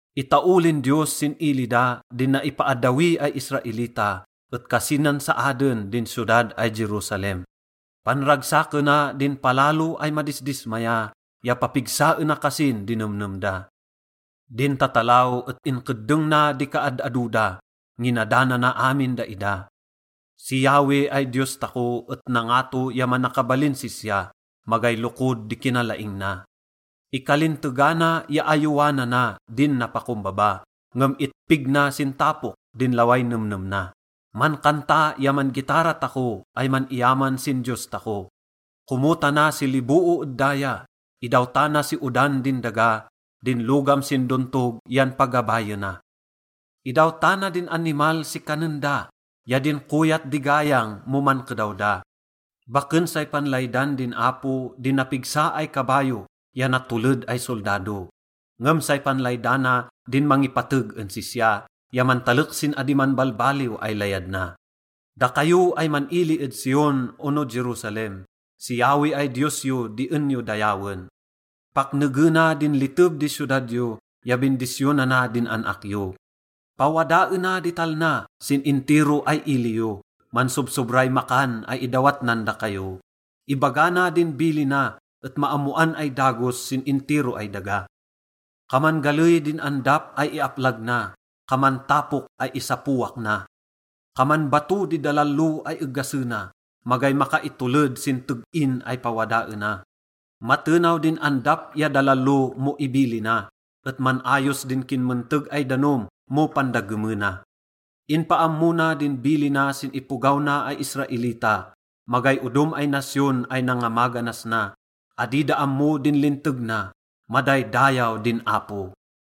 Itaolin Diyos sin ili da din naipaaddawi ay Israelita et kasinan saaden din siyodad ay Jerusalem. Panragsakena din palalo ay madisdismaya, ya papigsaena kasin di nemnem da. Din tatalaw et inkeddeng na di kaad-ado da, nginadanana amin daida. Si Yahweh ay Diyos tako et nangato ya manakabalin sisya, magay lokod di kinalaing na. Ikalintegana ya ayowanana din napakombaba, ngem itpig na sin tapok din laway nemnem na. Mankanta ya man-gitara tako ay man-iyaman sin Diyos tako. Komotana si liboo ed daya, idawtana si odan din daga, din logam sin dontog yan pagabayena. Idawtana din animal si kanen da ya din koyat di gayang mo mankedaw da. Baken say panlaydan din Apo di napigsa ay kabayo ya natoled ay soldado. Ngem say panlaydana din mangipateg en sisya ya mantalek sin adi manbalbaliw ay layad na. Dakayo ay man-ili ed Zion ono Jerusalem, si Yahweh ay Diyos yo di en yo dayawen. Paknegena din liteb di siyodad yo ya bindisyonana din an-ak yo. Pawadaena di talna sin intiro ay ili yo, mansobsobray makan ay idawat nan dakayo. Ibaga na din bilina et maammoan ay dagos sin intiro ay daga. Kaman galey din andap ay iaplag na, kaman tapok ay isapowak na. Kaman bato di dalalo ay egasena, magay makaitoled sin teg-in ay pawadaena. Matenaw din andap ya dalalo mo ibilina, et man-ayos din kinmenteg ay danom mo pandagemena. Inpaammo na din bilina sin ipogaw na ay Israelita. Magay odom ay nasyon ay nangamaganas na, adi da ammo din linteg na. Madaydayaw din Apo!